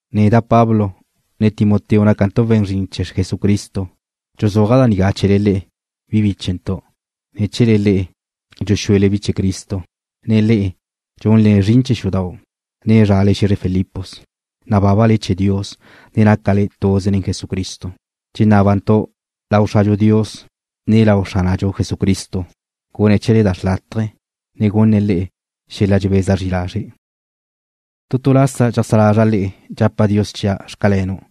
Neda' Pablo, ne Timoteo nácantu' we̱n zrin chee̱ Jesucristo. Dxuzúaja' da nigá chee̱le le'e, bi bíchentu', ne chee̱le le'e, dxuxúele bi chee̱ Cristo, ne le'e, zaj xu'u lu na'le bi chee̱ Cristo, ne zrale xe̱zre Filipos. Nabábale chee̱ Dios, ne nácale tuze nen Jesucristo. Dxenábantu' lau Xradxu Dios, ne lau Xránadxu Jesucristo gune̱' chee̱le da xrlátaje, ne gunne̱' le'e xel-la dxebeza zri lazre'. Tu tu lasa dxajsá lazra' le'e dxapa' Dios chia': Xcalenu'.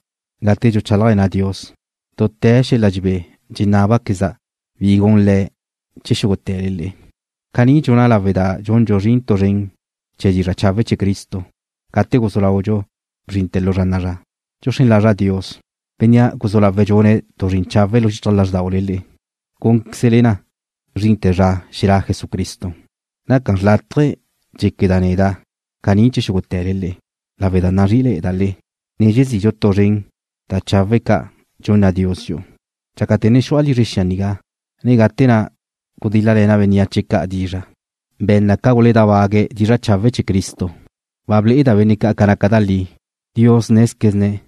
Gate dxuchálajle̱na' Dios, dute̱ xel-la dxebé dxenábaqueza' bi gun Le̱' chee̱ xúgute̱le le'e. Caní dxuna' lawe' da dxundxu zrin tu zren chee̱ dizra' chawe' chee̱ Cristo gate guzú lau núnbe̱'tu' na bzrinte̱ lu zra na'a zra. Dxuxrén lazra' Dios, Bénnea' guzú lawe̱' dxune̱' tu zrin chawe' lu xichaj lázrdaule le'e, gúnqueze̱' na ca zrinte̱ zra xelá' Jesucristo. Naca xrlátaje dxéqueda' neda' caní chee̱ xúgute̱le le'e, lawe' da nazrí'ile̱'e̱da' le'e, ne dxezidxu tu zren da chawe' ca' dxunna Dios dxi'u. Dxácate̱ ne xu'a lizre xia nigá, ne gate na' gudíl-lale̱na' bénneache ca' dizra', benne' ca' guledábague̱' dizra' chawe' chee̱ Cristo, ba ble'eda' benne' ca' naca na da li. Dios nézquezene̱'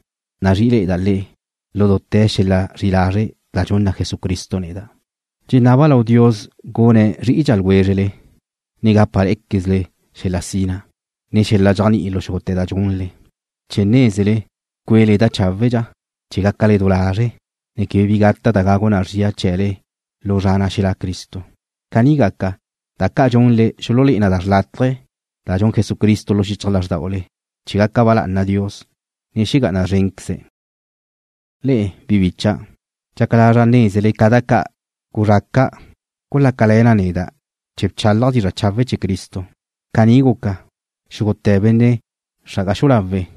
nazrí'ile̱'e̱da' le'e, lu dute̱ xel-la zri'i lazre' da dxunna Jesucristo neda'. Dxenaba' lau Dios gune̱' zrí'idxa ljwézrele, ne gápale̱'e̱quezle xel-la sina, ne xel-la dxéajni'i lu xúgute̱ da dxunle, chee̱ nézele cuele da cháwedxa, chee̱ gácale du lazre', ne quebe bi gata' da gagu na zria chee̱le lu zra na' xelá' Cristo. Caní gaca, da ca' dxunle xululé'e na da xrlátaje da dxun Jesucristo lu xichaj lázrdaule, chee̱ gaca ba lá'ana Dios, ne xegá'ana szrénqueze̱'. Le'e, bi bícha'dau', dxaca lazra' nézele ca da ca' guzraca' gulácale̱ na neda' chee̱ bchálaja' dizra' chawe' chee̱ Cristo. Caní guca, xúgute̱ benne' xra'aga xu'u lawe',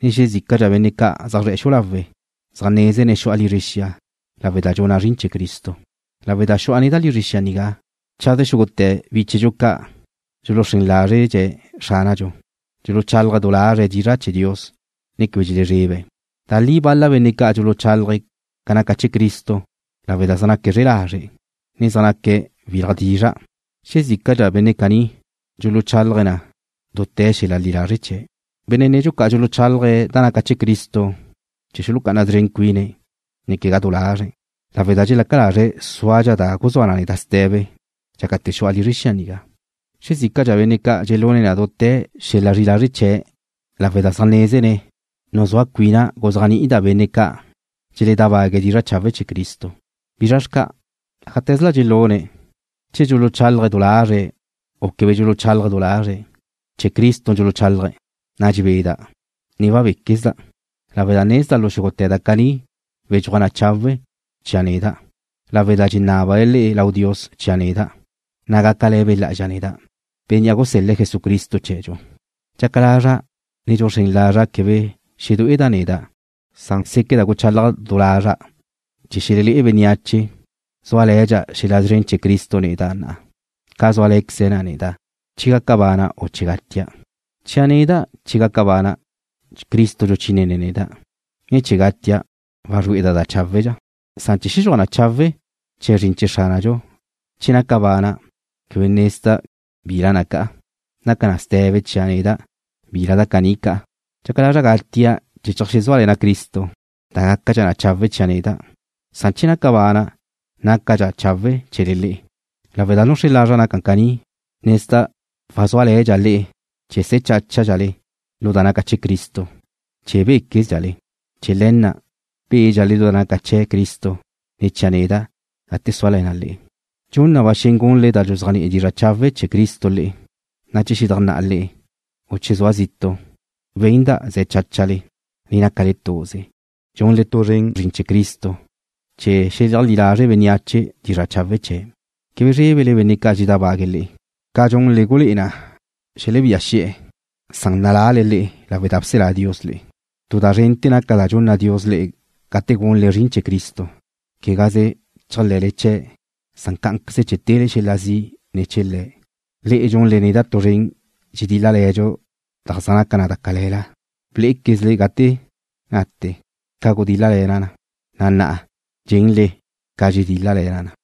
ne xezícadxa benne' ca' zaj zre̱'e̱ xu'u lawe' na' zaj nézene̱' xu'a lizre xia lawe' da dxuna' zrin chee̱ Cristo. Lawe' da xu'a neda' lizre xia nigá, chaze xúgute̱ bi bíchedxu ca' dxuluxrén lázredxe̱' Xránadxu, na' dxuluchálaje̱' du lazre̱' dizra' chee̱ Dios, ne quebe dxelezrebe̱'. Da li bal-la benne' ca' dxuluchálaje̱' ca naca chee̱ Cristo lawe' da zaj naque̱' zre'e lazre', ne zaj naque̱' wil-la dizra'. Xezícadxa benne' caní dxuluchálaje̱' na dute̱ xel-la li lazre' chee̱'. Benne' nedxu ca' dxuluchálaje̱' da naca chee̱ Cristo chee̱ xulucá'ana szren cuine̱', ne quegá du lazre̱', lawe' da dxelaca lazre̱' súadxa da guzúa na neda' ste̱be dxácate̱ xu'a lizre xia nigá. Xezícadxa benne' ca' dxelune̱' na dute̱ xel-la zri'i lazre' chee̱', lawe' da zaj nézene̱' nuzúa cuina' guzéajni'ida' benne' ca' dxeledábague̱' dizra' chawe' chee̱ Cristo. ¿Bizra xca'? Ájate̱zla dxelune̱', che dxuluchálaje̱' du lazre̱', u quebe dxuluchálaje̱' du lazre̱', dxuluchálaje̱' chee̱ Cristo, na' dxebeda', ne wabéquezda' lawe' da nezda' lu xúgute̱ da caní wedxúaj na chawe' chia' neda', lawe' da dxenábale le'e lau Dios chia' neda', na' gácale̱ Be' Lá'azxa neda', Bénnea' gusel-le̱' Jesucristo chee̱dxu. Dxaca lazra', ne dxuxrén lazra' quebe xedué'eda' neda', séqueda' guchálaja' du lazra' chee̱ xelelé'e bénneache zúale̱dxa xel-la szren chee̱ Cristo neda' na'a, ca zúale̱queze na neda', che gaca bana', u che gatia'. Chia' neda', che naca bana', Cristo dxuchínene̱' neda', ne che gatia' wazrue'eda' da cháwedxa. Che xedxúaj na chawe' chee̱ zrin chee̱ Xránadxu che naca bana', quebe nezda' bila na ca'a. Naca na ste̱be chia' neda' bila da caní ca'a. Dxaca lazra' gatia' chee̱ cheajsúale̱na' Cristo, da gácadxa chawe' chia' neda', san che naca bana' nácadxa chawe' chee̱le le'e. Lawe' da nuxrén lazra' naca caní, nezda' wazúale̱dxa' le'e chee̱ se̱ cháchadxale lu da naca chee̱ Cristo, ne chee̱ béquezdxale. Chee̱ le̱ na' bédxale lu da naca chee̱ Cristo ne̱ chia' neda' gate súale̱na' le'e. Dxun na ba xen gunle da dxuzéajni'i dizra' chawe' chee̱ Cristo le'e, na' che xedajnná'a le'e, u che sua' zitu', wenda' ze̱ cháchale, ne nácale tuze, dxunle tu zren zrin chee̱ Cristo chee̱ xeleajlí lazre' bénneache dizra' chawe' chee̱'. Quebe zrébele benne' ca' dxeledábague̱' le'e. Ca dxunle gulé'e na le̱' xelebía xi'e̱, na' nalale le'e lawe' da bselá Dios le'e. Tu da zrente̱ naca da dxunna Dios le'e gate gunle zrin chee̱ Cristo, quegaze chéajle̱le chee̱', na' cá'anqueze che tele xel-la zi' ne̱ chee̱ Le̱'. Le'e dxunle neda' tu zren dxedíl-lale̱dxu da zaj naca da cale̱la. Blé'equezle gate nate ca gudíl-lale̱na' na, na' na'a dxenle ca dxedíl-lale̱na' na.